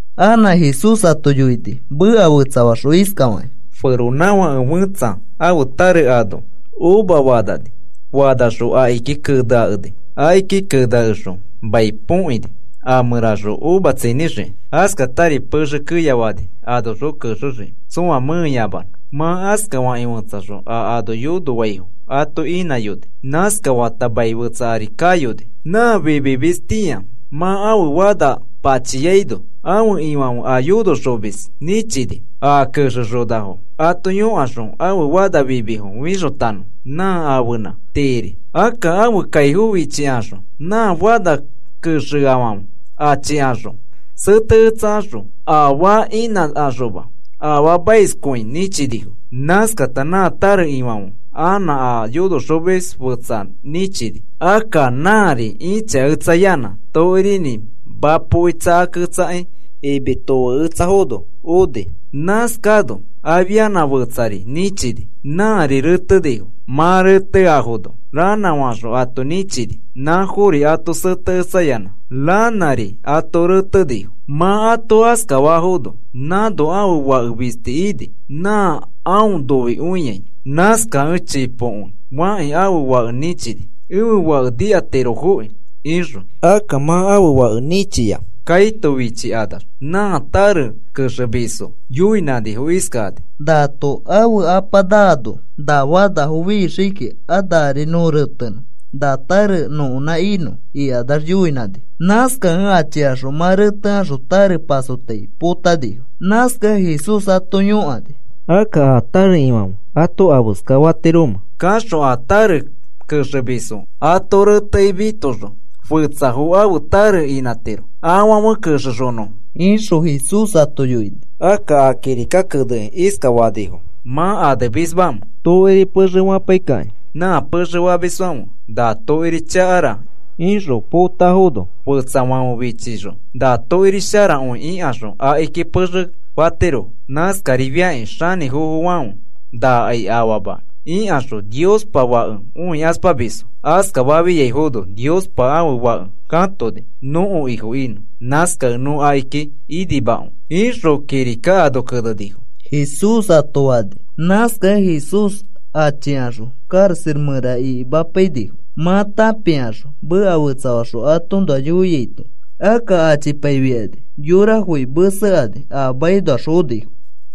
Anã Jesús ato yoini meka fetsafaxõ iskafakĩ: “Feronãfake fẽtsa ãfe tare ano uva fanani. Fanaxõ akiki keneakeni. Akiki keneakexõ mai põkini a mẽraxõ uva tsinĩxiki. Askatari pexe keya fani anoxõ kexexiki tsõa mẽeyamanõ. Mã askafakĩ fetsaxõ a ano yonofaifo ato inãyoni. Nãskafata mai fetsa ari kayoni. Nã fimimistĩa mã ãfe fana pachiaino, ãfe ifãfe a yonoxomis nĩchini, a kexexonafo ato yõkaxõ ãfe fana fimifo fixotanõ nã ãfenã tiiri. Akka ãfe kaifo fichikaxõ nã fana kexeafãfe achikaxõ seteketsakaxõ, afaa inãkaxoma afaamaiskõi nĩchinifo. Nãskata nã tare ifãfe anã a yonoxomis fetsa nĩchini. Akka nãri ĩchaketsayanã tokirinĩ mapoki tsakakĩ imi tofeketsafono oni. Nãskano afianã fetsari nĩchiano nãa retenifo. Mã reteafono ranãfaxõ ato nĩchini, nãfori ato seteketsayanã, ranãri ato retenifo. “Mã ato askafafono, nãno ãfe fake fisti ini, nã aõ noikõiai. Nãskakẽ chipokõi fakĩ ãfe fake nĩchini: ‘Ẽfe fake nikatirofokĩ,’ ixõ. Akka mã ãfe fake nĩchia kaito fichikanax nã tare kexemisfo yoinãnifo iskakani: ‘Nato ãfe apa naano na fanafo fixii kiki, a nari nõ retenõ na tare nõkonã inõ,’” ikanax yoinãnifo. Nãskakẽ achikaxõ mã retekaxõ tare pasotai potanifo. Nãskakẽ Jesús ato yõkani: “Akka, ¿a tare ifãfe ato afeska fatiromẽ? Kaxõ a tare kexemisfo ato retekĩ mitoxõ fetsafo ãfe tare inãtiro afãfe kexexonõfo,” ixõ Jesús ato yoini. “Akka, ¿a kirika kenekĩ iskafanifo mã anemismamẽ?: Tokiri pexe fapaikakĩ nã pexe famisfãfe na tokiri chakara ixõ potafono, fetsafãfe fichixõ na tokiri sharakõi ikaxõ akiki pexe fatirofo. Nãskarifiakĩ xanĩfofofãfe, ‘Nakai afama,’ ikaxõ Niospa Fake õikaspamisfo. Askafafiaifono Niospa ãfe Fake katoni nõko Ifo inõ. Nãskakẽ nõ akiki inimakõi, ixõ kirika ano kenenifo,” Jesús ato fani. Nãskakẽ Jesús achikaxõ karaxa mẽra ikimapainifo, mã tãpikaxõ meka fetsafaxõ atoõnoa yoiaito. Akka achipaifikani yorafoki mesekani a makinoax fonifo.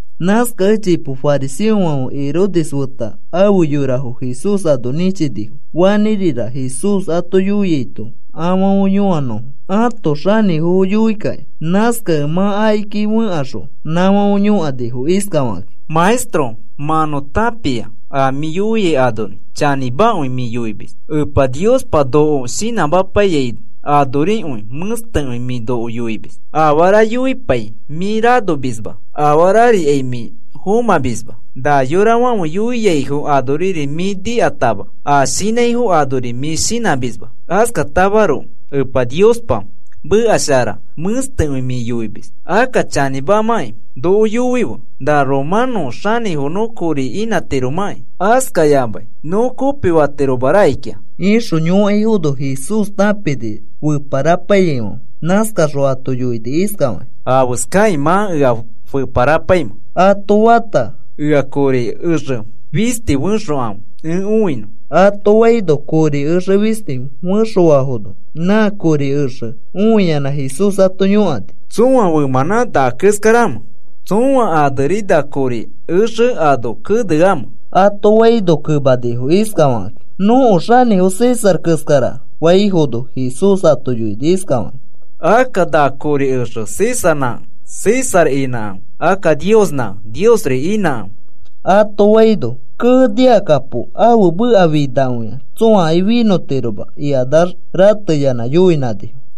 Nãskakẽ chipo fariseofãfe Herodes feta afe yorafo Jesús ano nĩchinifo, fanĩrira Jesús ato yoiaito afãfe yõanõfo ãto xanĩfofo yoikakĩ. Nãskakẽ mã akiki fẽkaxõ nãfãfe yõkanifo iskafakakĩ: “Maestro, mã nõ tãpia a mĩ yoiai anori chanĩmakõi mĩ yoimis. Epa Niospa noko shinãmapaiyai anorikõi mẽstekõi mĩ noko yoimis. Afara yoipai mĩ ranomisma, afarikai mĩ fomãmisma, na yorafãfe yoiaifo anori mĩ nikatama, a shinãifo anori mĩ shinãmisma. Askatamaroko Epa Niospa meka shara mẽstekõi mĩ yoimis. Akka chanĩmamakĩ noko yoife na romanõ xanĩfo nõ kopifatiromakĩ askayamakĩ nõ kopifatiroma rakikĩa,” ixõ yõkaifono, Jesús tãpini feparapaiyaifãfe, nãskaxõ ato yoini iskafakĩ: “¿Afeskakĩ mã ea feparapaimẽ?” ato fata, “Ea kori exe fisti fẽxokãfe, ẽ õinõ,” ato faino, kori exe fisti fẽxofafono, nã kori exe õiyanã Jesús ato yõkani: “¿Tsõa femãnã na keskaramẽ? ¿Tsõa aneri na kori exe ano keneamẽ?” ato faino, kemanifo iskafakakĩ: “Nõko xanĩfo César keskara,” faifono, Jesús ato yoini iskafakĩ: “Akka na kori exe Césarnãkẽ César inãkãfe, akka Niosnãkẽ Niosri inãkãfe,” ato faino, “¡Kee! ¡Nikakapo! Ãfe meka finakõia tsõakai finõtiroma,” ikanax rateyanã yoinãnifo.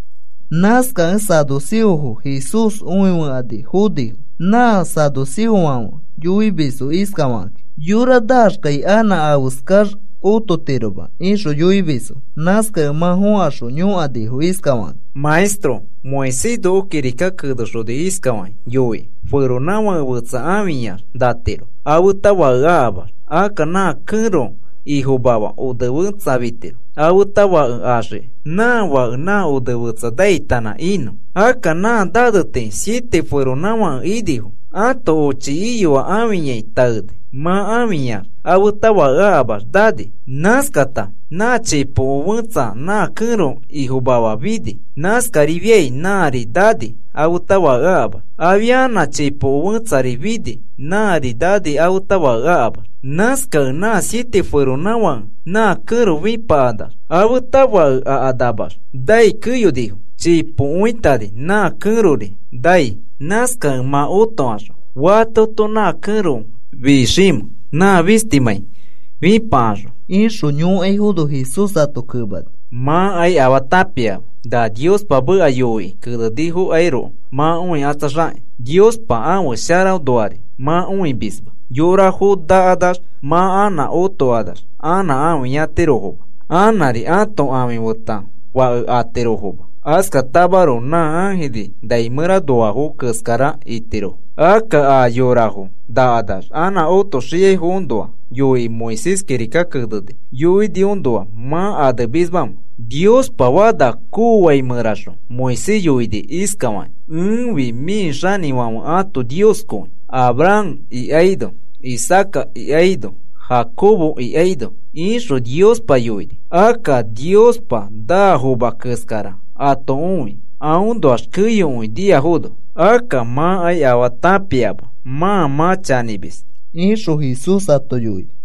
Nãskakẽ saduceofo Jesús õifokani fonifo. Nã saduceofãfe yoimisfo iskafakakĩ: “Yora naaxkai anã afeskax ototiroma,” ixõ yoimisfo. Nãskakẽ mã fokaxõ yõkanifo iskafakakĩ: “Maestro, Moisés noko kirika kenexoni iskafakĩ yoikĩ: ‘Feronãfake fetsa ãfiyax natiro afeta fake akamax, akka nã kẽro ifomafa onefẽtsa fitiro, afeta fake axiki nã fake nã onefetsa naitanã inõ.’ Akka nã nane tii siete feronãfake inifo. Ãto ochi iyoa ãfiyai taeni, mã ãfiyax afeta fake akamax nani. Nãskata nãa chipoko fẽtsa nã kẽro ifomafa fini. Nãskarifiai nãari nani afeta fake akamax. Afianã chipoko fẽtsari fini, nãari nani afeta fake akamax. Nãskakẽ nã siete feronãfakefãfe nã kẽro fĩpakanax, afeta fake akanamax nai keyonifo. Chipokõitani nã kẽrori nani. “Nãskakẽ mã otokaxõ, ¿fatoto nã kẽro fiximẽ, nã fistimãi fĩpakaxõ?” ixõ yõkaifono, Jesús ato kemani: “Mãkai afaa tãpiama. Na Niospa meka yoikĩ kenenifokairoko mã õikatsaxakĩ. Niospa ãfe sharaõnoari mã õimisma. Yorafo nakanax mã anã otokanax, anã ãfiyatirofoma, anãri ãto ãfi feta fake atirofoma. Askatamaroko nã ãjiri nai mẽranoafo keskara itirofo. Akka, ¿a yorafo nakanax anã otoxiaifoõnoa yoikĩ Moisés kirika kenekĩ yoiniõnoa mã anemismamẽ? Niospa fana koofai mẽraxõ Moisés yoini iskafakĩ: ‘Ẽfi mĩ xinifãfe ãto Nioskõi, Abraham ikaino, Isaaca ikaino, Jacobo ikaino,’ ixõ Niospa yoini. Akka Niospa naafoma keskara ato õi, aõnoax keyokõi niafono. Akka mãkai afaa tãpiama mã mã chanĩmis,” ixõ Jesús ato yoini.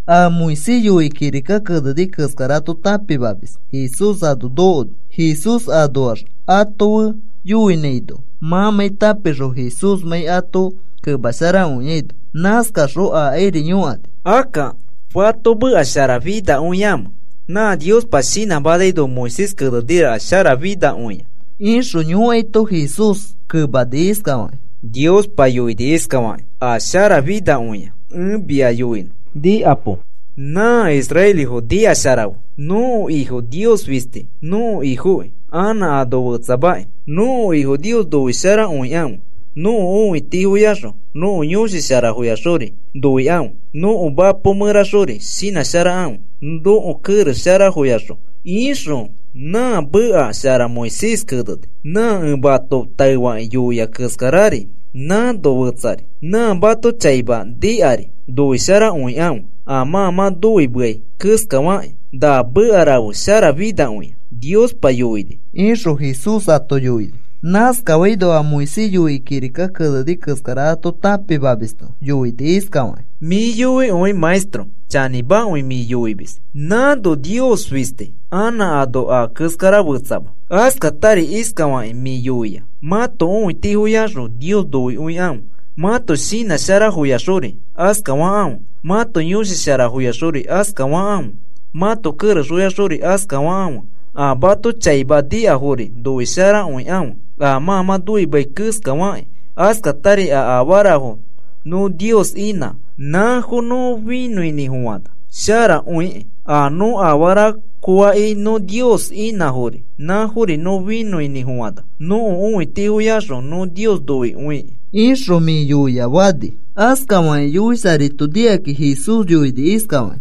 A Moisés yoikĩ kirika keneni keskara ato tãpimamis Jesús ano nokoni, Jesús anoax ato fe yoinãino mãmãi tãpixõ Jesúsmãi ato kemasharakõiaino. Nãskaxõ akairi yõkani: “Akka, ¿fato meka sharafinakõiamẽ, nã Niospa shinãmanaino Moisés keneniraka sharafinakõia?” ixõ yõkaito, Jesús kemani iskafakĩ: “Niospa yoini iskafakĩ: ‘A sharafinakõia ẽ mia yoinõ nikapo. Nã israelifo nikasharafe, nõko Ifo Nios fisti nõko Ifokĩ anã ano fetsamaki. Nõko Ifo Nios noisharakõikãfe nõko õitifoyaxõ, nõko yõshi sharafoyaxori noikãfe. Nõko mapo mẽraxori shinãsharakãfe, nõko kerex sharafoyaxõ,’ ixõ nã meka shara Moisés keneni. Nã ẽ mato taefakĩ yoia keskarari nãno fetsari. ‘Nã mato chaima nikari noisharakõikãfe a mã mã noimesharakõiai keskafakãfe.’ Na meka rafe sharafinakõia Niospa yoini,” ixõ Jesús ato yoini. Naskafaito a Moisés yoikĩ kirika keneni keskara ato tãpimamisto yoini iskafakĩ: “Mĩ yoikõi. Maestro, chanĩmakõi mĩ yoimis. Nãno Nios fisti, anã ano a keskara fetsama. Askatari iskafakĩ mĩ yoia, mãto õitifoyaxõ Nios noikõikãfe, mãto shinã sharafoyaxori askafakãfe, mãto yõshi sharafoyaxori askafakãfe, mãto kerexfoyaxori askafakãfe, a mato chaima nikafori noisharakõikãfe, a mã mã noimeai keskafakĩ askatari a afarafo nõ Nios inã, nãfo nõ finõinĩfofana sharakõikĩ. A nõ afara koakĩ nõ Nios inãfori nãfori nõ finõinĩfofana nõko õitifoyaxõ nõ Nios noikõikĩ,” ixõ mĩ yoia fani. Askafakĩ yoisharaito nikakĩ Jesús yoini iskafakĩ: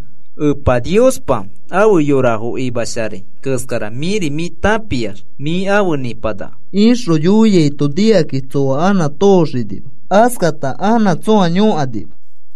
“Epa Niospa afe yorafo imasharai keskara mĩri mĩ tãpiax mĩ afe nĩpanaka,” ixõ yoiaito, nikakakĩ tsoa anã tooxinima. Askata anã tsõa yõkanima.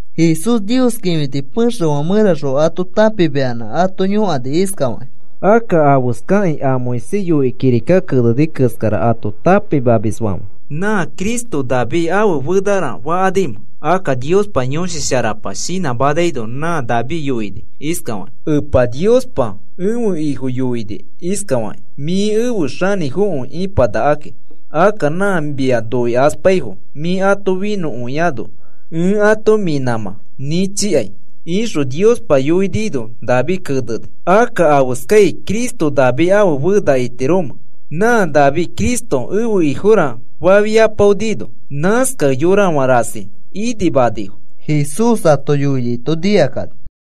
Jesús Nios kĩfiti pexefã mẽraxõ ato tãpimayanã ato yõkani iskafakĩ: “Akka, ¿afeskakĩ a Moisés yoikĩ kirika keneni keskara ato tãpimamisfãfe na Cristo David ãfe fenara fakanimẽ? Akka Niospa Yõshi Sharapa shinãmanaino nã David yoini iskafakĩ: Epa Niospa ẽfe Ifo yoini iskafakĩ: ‘Mĩ efe xanĩfokõi ĩpanakaki. Akka nã mia noikaspaifo mĩ ato finõkõinõ ẽ ato mĩ nãmã nĩchikai.’ ixõ Niospa yoinino David keneni. “Akka, ¿afeskai Cristo David ãfe fena itiromẽ, nã David Cristo ẽfe Ifora fafiapaonino?” Nãskakẽ yõrafã rasi inimanifo Jesús ato yoiaito nikakani.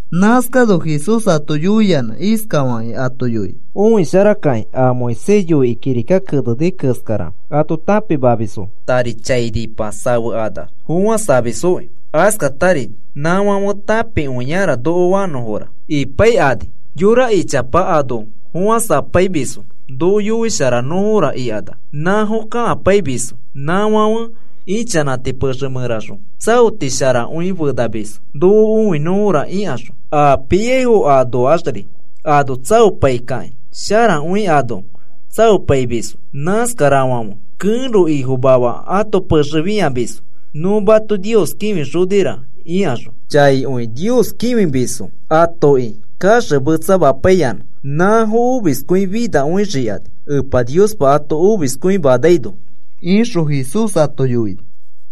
Nãskano Jesús ato yoiyanã iskafakĩ ato yoini: “Õisharakakĩ a Moisés yoikĩ kirika keneni keskara ato tãpimamisfo tari chainipa safekanax fofãsamisfoki, askatari nafãfe tãpikõiara noko fanõfora ipaikani. Yora ichapafo ano fofãsapaimisfo noko yoisharakõinõra ikanax, nãfo kakapaimisfo. Nãfãfe ichanãti pexe mẽraxõ tsaoti sharakõi fenamisfo noko õinõfora ikaxõ. A piaifo anoaxri ano tsaopaikakĩ sharakõi ano tsaopaimisfo. Nãskarafãfe kẽro ifomafafo ato pexe fĩamisfo, nõ mato Nios kĩfixonira ikaxõ chaikõi Nios kĩfimisfo atoki kaxemetsamapaiyanã. Nãfo omiskõi finakõixikani Epa Niospa ato omiskõimanaino,” ixõ Jesús ato yoini.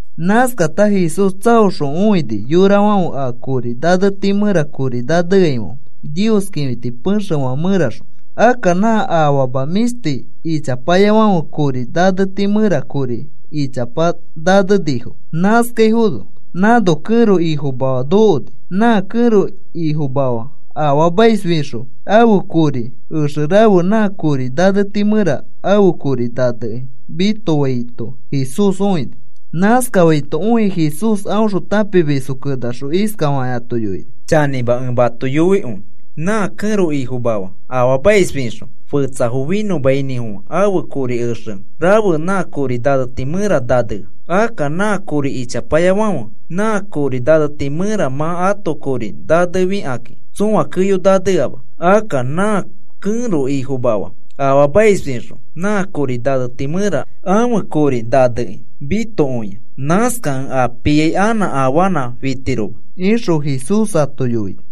Nãskata Jesús tsaoxõ õini yorafãfe a kori naneti mẽra kori naneaifãfe Nios kĩfiti pexefã mẽraxõ. Akka nã afama mĩshti ichapayafãfe kori naneti mẽra kori ichapa nanenifo. Nãskafaifono nãno kẽro ifomafa nokoni. Nã kẽro ifomafa afaamais fixõ ãfe kori exe rafe nã kori naneti mẽra ãfe kori nanekĩ mitofaito Jesús õini. Nãskafaito õikĩ Jesús aõxõ tãpimisfo kenaxõ iskafakĩ ato yoini: “Chanĩma ẽ mato yoikõi, nã kẽro ifomafa afaamaisfixõ fetsafo finõmainĩfofã ãfe kori exe rafe nã kori naneti mẽra nanea. Akka nã kori ichapayafãfe nã kori naneti mẽra mã ãto kori nanefikakĩ tsõa keyo naneama. Akka nã kẽro ifomafa afaamaisfixõ nã kori naneti mẽra ãfe kori nanekĩ mitokõia. Nãskakẽ a piai anã afanã fitiroma,” ixõ Jesús ato yoini.